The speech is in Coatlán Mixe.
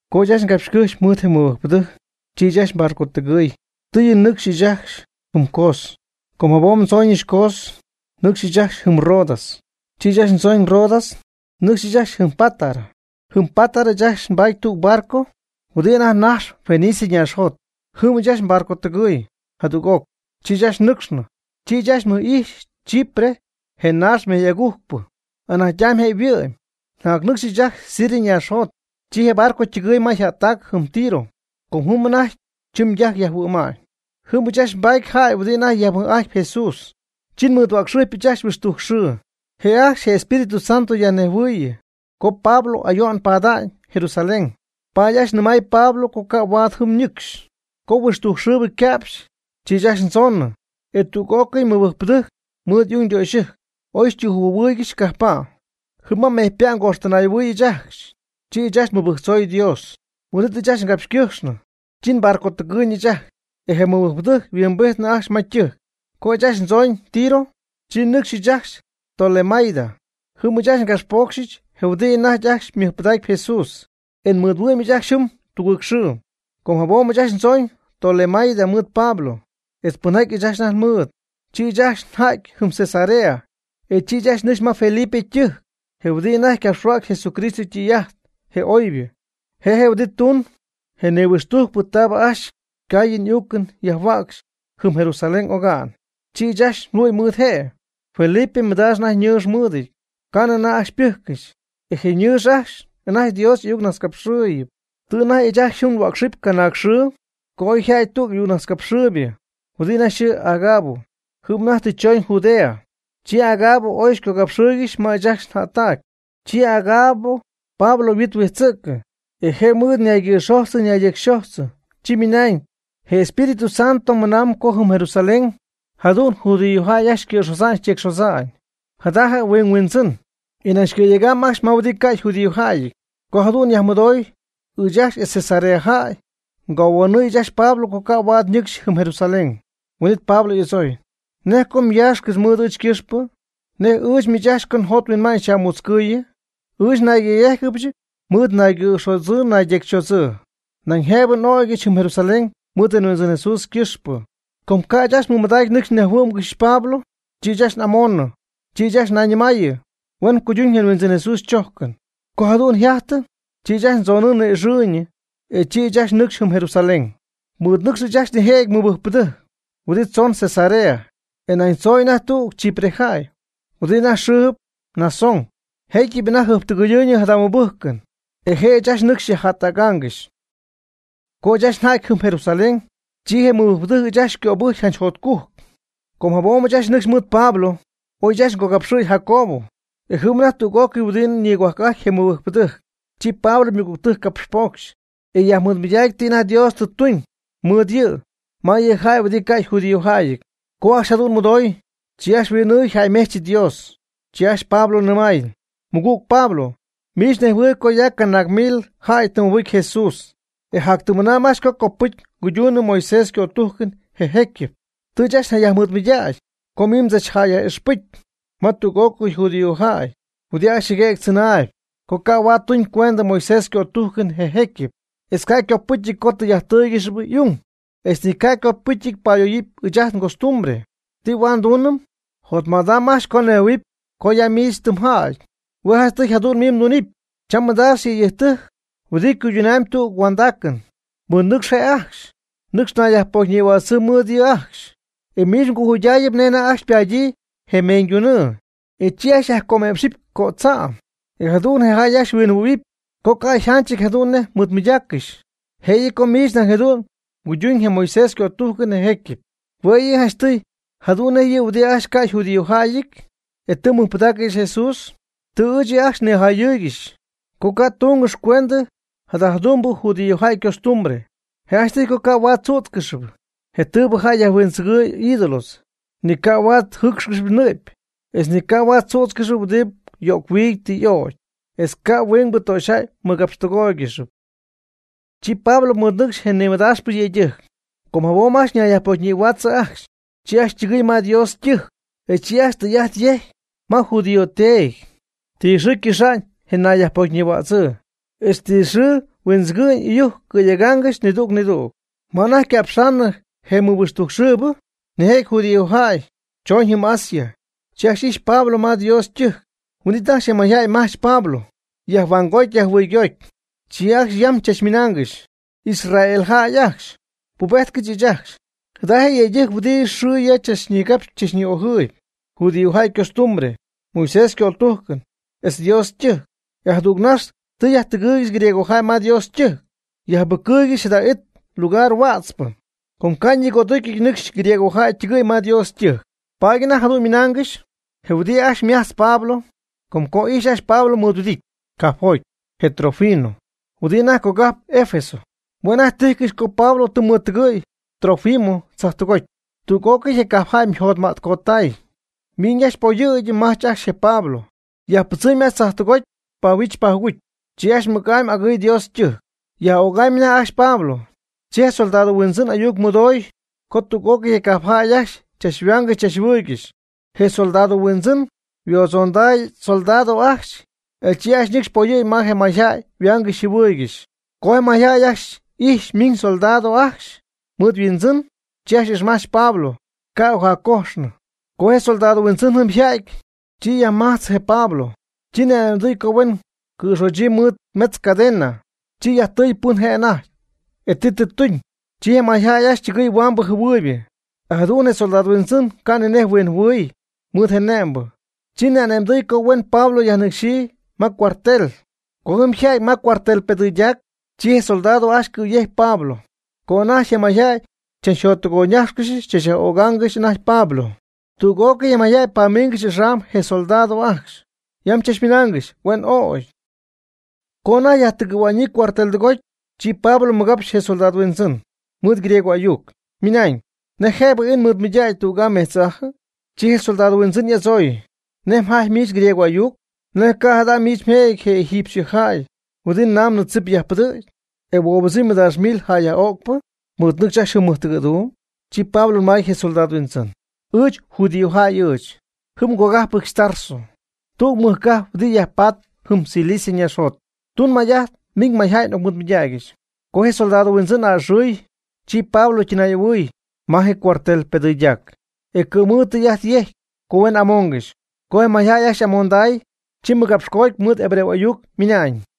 Co ɨɨch ajcxy ngapxycɨ́jxy mɨɨd je mɨbɨjcpɨdɨjc, chi ɨɨch ajcxy nbarcotɨgɨɨy, tɨɨyɨ nɨcxy ɨɨch ajcxy jɨm Cos. Com jabom ndzooñɨch Cos nɨcxy ɨɨch ajcxy jɨm Rodas. Chi ɨɨch ajcxy ndzooñ Rodas nɨcx ɨɨch ajcxy jɨm Pátara. Jɨm Pátara ɨɨch ajcxy nbaaty tüg barco huɨdi anajty najxp Fenicia ñaaxjot. Jɨm ɨɨch ajcxy nbarcotɨgɨɨy jadüg'oc, chi ɨɨch ajcxy nnɨcxnɨ. Chi ɨɨch ajcxy mmɨj'ijxy Chipre je naax mejy'agujcpɨ, anajty'amy je' yhuɨ'my. Jacnɨcxy ɨɨch ajcxy Siria ñaaxjot, chi je barco ytɨgɨɨy ma yjättac jɨm Tiro co jɨm anajty chɨmydajc yajhuɨ̈ma'ñ. Jɨm ɨɨch ajcxy nbaty jäy huɨdi anajty yajmɨj'ajtp Jesús, chi nmɨɨdhuäcxɨjpɨch ajcxy huixtujc xɨɨ. Je' ajcxy je Espíritu Santo yajnejhuɨɨyɨ co Pablo ayo'n pada'ñ Jerusalén, paady ajcxy nɨmay Pablo co ca' huaad jɨm ñɨcxy. Co huixtujc xɨɨbɨ yca'pxy, chi ɨɨch ajcxy ndzoonɨ. E tüg'ócɨy mɨbɨjcpɨdɨjc mɨɨd y'ung ytöxyɨjc oy xytüjɨjphuohuɨ́ɨygɨxyɨch cajppa'. Jɨm ma mejypa' ngoxtɨnay'ahuɨɨy ɨɨch ajcxy, chi ɨɨch ajcxy nmɨbɨjctzoy Dios. Huin'it ɨɨch ajcxy ngapxycɨjxnɨ, chi nbarcotɨgɨɨyñɨ ɨɨch ajcxy e je mɨbɨjcpɨdɨjc yhuimbijtnɨ ajcxy ma ytɨjc. Co ɨɨch ajcxy ndzooñ Tiro, chi nɨcxy ɨɨch ajcxy Tolemaida. Jɨm ɨɨch ajcxy ngapxpocxɨch je huɨdi anajty ajcxy mɨjpɨdaacp Jesús, e nmɨɨdhuɨ'my ɨɨch ajcxy jɨm tüg xɨɨ. Com jabom ɨɨch ajcxy ndzooñ Tolemaida mɨɨd Pablo etz pɨnjaty ɨɨch ajcxy anajty nmɨɨd. Chi ɨɨch ajcxy nja'ty jɨm Cesarea. E chi ɨɨch ajcxy nɨcx ma Felipe ytɨjc, je huɨdibɨ anajty capxhuäcxy Jesucristo ytɨy'ajt je oybɨ. Je' je' huɨdi tuun je nihuixtujcpɨ taabɨ ajcxy caayɨn uucɨn yajhuäcxy jɨm Jerusalén oga'n. Chi ɨɨch ajcxy nhuɨ'my mɨɨd je'. Felipe mɨdaax anajty ñɨɨx mɨɨdɨty, ca'nɨ anajty ajcxy ypɨjccɨxy. E je' ñɨɨx ajcxy anajty Dios y'ayucnajtzcapxɨɨyɨpy. Tɨ anajty ɨɨch ajcxy jɨm nhuäcxɨpy canaag xɨɨ co oy yjäty tüg ayucnajtzcapxɨɨybɨ huɨdi anajty yxɨɨ Agabo, jɨm anajty tɨ chooñ Judea. Chi Agabo y'oy xycogapxɨɨygɨxy ma ɨɨch ajcxy njättac. Chi Agabo Pablo yhuɨɨn huijtzɨ̈ccɨ, e je' mɨɨd ñaygɨ̈xojtz ñaydecyxojtzɨ, chi ymɨnañ: ―Je Espíritu Santo jadu'n mɨnamb co jɨm Jerusalén jadu'n judíojäy ajcxy cɨ̈xodza'ñ tecyxodza'ñ jada huɨɨn yhuindzɨn, e nañ cɨ̈yega'ñ ajcxy ma huɨdi ca' yjudíojäyɨty. Co jadu'n yajmɨdoy, ɨɨch ajcxy etz je Cesarea jäy ngohuanɨɨy ɨɨch ajcxy Pablo co ca' huaad ñɨcxy jɨm Jerusalén. Huin'it Pablo y'adzooy: ―¿Nej co myaaxcɨxy mɨɨd ɨɨch ycɨxpɨ? ¿Nej ɨɨch miich ajcxy co njot nhuinma'ñ xyaj'amutzcɨɨyɨ? Ɨɨch nayyéjcɨbɨch mɨɨd naygɨ̈xodzɨɨ naydecyxodzɨɨ, nañ jëbɨ n'ögɨbɨch jɨm Jerusalén mɨɨd je Huindzɨn Jesús ycɨxpɨ. Co ca' ɨɨch ajcxy mɨmadacy nɨcxy nyajhuɨ́'mgɨxyɨch Pablo, chi ɨɨch ajcxy n'amoonɨ, chi ɨɨch ajcxy ñayñɨmaayɨ: ―Huen cuyduñ je Huindzɨn Jesús chojcɨn. Co jadu'n yjajtɨ, chi ɨɨch ajcxy ndzonɨɨ ni'ixɨɨy e chi ɨɨch ajcxy nɨcxy jɨm Jerusalén. Mɨɨd nɨcxy ɨɨch ajcxy nijëjɨty mɨbɨjcpɨdɨjc huɨdi tzoon Cesarea, e nañ tzooñ anajty tüg Chipre jäy huɨdi anajty yxɨɨ Mnasón, jecyɨp anajty jɨjptɨgɨyɨɨyñɨ jada mɨbɨjcɨn e je' ɨɨch ajcxy nɨcxy xyajjättägaangɨxy. Co ɨɨch ajcxy nja'ty jɨm Jerusalén, chi je mɨbɨjcpɨdɨjc ɨɨch ajcxy xycöbɨjcy janch jotcujc. Com jabom ɨɨch ajcxy nɨcxy mɨɨd Pablo, y'oy ɨɨch ajcxy ngogapxɨ̈y Jacobo, e jɨm anajty tüg'ócɨy huɨdi nigohuajc'ajtp je mɨbɨjcpɨdɨjc. Chi Pablo ymɨgügtɨjc capxpocxy, e yajmɨɨdmɨydacy ti anajty Dios tɨ tuñ mɨɨd yɨ' ma yɨ jäy ajcxy huɨdi ca' yjudíojäyɨty. Co ajcxy jadu'n mɨdooy, chi ajcxy huin'ɨɨy jäymejch yɨ Dios, chi ajcxy Pablo nɨmay: ―Mɨgüg Pablo, miich mnejhuɨɨyb co ya canaag mil jäy tɨ mɨbɨcy Jesús, e yjactɨmmɨna'ñ ajcxy co copɨcy nguyduunɨm Moisés ycötujcɨn je jecyɨp. Tɨ ajcxy yajmɨɨdmɨydägyii co miich mdzachjäyyaj'ixpɨcy ma tüg'ócɨy judíojäy huɨdi ajcxy jɨguëgy adzɨnaayb co ca' huaad tuñycuentɨ Moisés ycötújcɨn je jecyɨp, etz ca' ycopɨcyɨty co tɨy'ajttɨ́ɨygɨxɨpy y'ung, etz ni ca' ycopɨcyɨty payöyɨpy ɨɨch ajt ngostumbre. ¿Ti huaad nduunɨm? Jotmädam ajcxy co nejhuɨ̈huɨpy co ya miich tɨ mjäty. Hue' janchtɨy jadu'n miich mdunɨpy: cha mɨdaax yëydɨjc huɨdi cuydunamy tüg huandaacɨn. Mɨɨdnɨcxy je' ajcxy, nɨcx nayyajpocyñïhuaatzɨ mɨɨd yɨ' ajcxy, e miich mgojuydayɨpy nej anajty ajcxy ypadyii je meeñydunɨɨ. E chi ajcxy myajcöme'pxɨpy cödza'm, e jadu'n je jäy ajcxy huinjɨhuɨydähuɨpy co ca' yjanchɨty jadu'n nej xyñimɨydaaccɨxy, jëyɨ co miich nañ jadu'n mguydun je Moisés ycötujcɨn je jecyɨp. Huɨdibɨ janchtɨy jadu'n nej yɨ huɨdibɨ ajcxy ca' yjudíojäyɨty, e tɨ mɨjpɨdaaccɨxy Jesús, tɨ ɨɨch yɨ' ajcxy nijayɨ́ɨygɨxɨch co ca' túngɨxɨpy cuentɨ jada jadu'mbɨ judíojäy ycostumbre. Je' janchtɨy co ca' huaad tzützcɨxɨpy je tɨɨbɨ jäy yajhuindzɨgɨ̈y ídolos, ni ca' huaad jɨ́ɨcxcɨxɨpy nɨ'py, etz ni ca' ajcxy tzüdzɨpy huɨdi yo'c-huiidy tɨ y'ögy, etz ca' ajcxy huingbɨ töxyjäy mɨgapxtɨgóoygɨxɨpy. Chi Pablo mɨɨd nɨcxy je nimɨdaaxpɨ yëydɨjc, com jabom ajcxy nayyajpocyñïhuaatzɨ ajcxy, chi ajcxy ytɨgɨɨy ma Dios ytɨjc, e chi ajcxy ytɨy'ajt yejcy ma judío teedy ti xɨɨ ycɨxa'ñ je nayyajpocyñïhuädzɨɨ, etz ti xɨɨ huindzɨgɨ'ñ ɨyujc cɨ̈yegaangɨxy nidüg nidüg. Ma anajty yca'pxaanɨ je mɨhuixtujcxɨɨbɨ nijëjɨty judíojäy, chooñ jɨm Asia, chi ajcxy ijxy Pablo ma Dios ytɨjc. Huin'it ajcxy je mayjäy majch Pablo, yajhuangoty yajjɨhuɨygoty, chi ajcxy yam chachmɨnaangɨxy: ―¡Israel jäy ajcxy, pubejtcɨch ɨɨch ajcxy! Jada je' je yëydɨjc huɨdi xɨ ya tzach nigapxp ni'ojɨɨyb judíojäy ycostumbre, Moisés ycötújcɨn, etz nDios ytɨjc. E jadüg nax tɨ yajtɨgɨɨygɨxy griegojäy ma Dios ytɨjc, yajjɨbɨcɨɨygɨxy jada it lugar huätzpɨ. (Com ca' ñigödúcyɨty nɨcxy griegojäy ytɨgɨ̈y ma Dios ytɨjc.) Paady anajty jadu'n ymɨnaangɨxy je huɨdi ajcxy majtz je Pablo, com co ijxy ajcxy Pablo mɨɨdhuɨdity cajpjoty je Trófimo, huɨdi anajty cogajp Efeso. Hue' anajty tijcɨxy co Pablo tɨ mɨɨdtɨgɨ̈y Trófimo tzajtɨgoty. Tüg'ócɨy je cajpjäy yjotmätcottay, miiñ ajcxy poyɨ̈gy majch ajcxy je Pablo yajpɨdzimy tzajtɨgoty pahuijch pajugujcy. Chi ajcxy mɨc'amy agɨɨy Dios ytɨjc. Yaj'ögamyb anajty ajcxy Pablo. Chi je soldado huindzɨn ayuc mɨdoy co tüg'ócɨy je cajp jäy ajcxy tɨ chachhuaangɨxy chachjɨhuɨɨygɨxy. Je soldado huindzɨn huodzonday ysoldado ajcxy, e chi ajcxy ñɨcxy poyɨ̈gy ma je mayjäy yhuaangɨxy yjɨhuɨɨygɨxy. Co je mayjäy ajcxy ijxy miñ soldado ajcxy mɨɨd yhuindzɨn, chi ajcxy ixmajch Pablo ca' ocjaccójxcɨxnɨ. Co je soldado huindzɨn jɨm ja'ty, chi yajmajtzɨ je Pablo, ni'anëmdɨy co huen cɨ̈xochyii mɨɨd mejtz cadena. Chi yajtɨɨy pɨn je' anajty, e ti tɨ tuñ. Chi je mayjäy ajcxy ytɨgɨɨy huaambɨ jɨhuɨɨybɨ, e jadu'n je soldado huindzɨn ca' ni nej huinjɨhuɨɨy mɨɨd je ne'mbɨ. Chi ni'ane'mdɨy co huen Pablo yajnɨcxyii ma cuartel. Co jɨm yja'ty ma cuartel pedɨydac, chi je soldado ajcxy cɨyɨ̈gy Pablo, co anajty je mayjäy chachjottɨgoyñájxcɨxy tzachyaj'ögaangɨxy anajty Pablo. Tüg'ócɨy je mayjäy pamiingɨxy axam je soldado ajcxy, yam chachmɨnaangɨxy: ―¡Huen ögy! Co anajty yajtɨgɨ̈hua'ñyii cuartel tɨgoty, chi Pablo mɨgapxy je soldado huindzɨn mɨɨd griego ayuc, ymɨnañ: ―¿Nej jëbɨ ii nmɨɨdmɨydägy tüg'aa metz'aajɨ? Chi je soldado huindzɨn y'adzooy: ―¿Nej mjajtpy miich griego y'ayuc? ¿Nej ca' jada' miich jëjɨty je egipcio jäy huɨdi namnɨ tzip yajpɨdɨ̈cp, e huobɨdzɨmy mɨdaax mil jäy yaj'öcpɨ, mɨɨd nɨcxy ajcxy jɨm mɨjtɨgɨ̈duum? Chi Pablo nɨmay je soldado huindzɨn: ―Ɨɨch judíojäy ɨɨch, jɨm ngogájpɨdyɨch Tarso, tüg mɨjcajp huɨdi yajpatpɨ jɨm Cilicia ñaaxjot. Tun may'ajt miñ mayjäy n'ocmɨgapxɨch. Co je soldado huindzɨn a'ɨxɨɨy, chi Pablo ytɨnay'ahuɨɨy ma je cuartel pedɨydac, e cɨ̈mɨɨd ytɨy'ajt yejcy co huen amoongɨxy. Co je mayjäy ajcxy y'amonday, chi mɨgapxcoty mɨɨd hebreo ayuc ymɨnañ: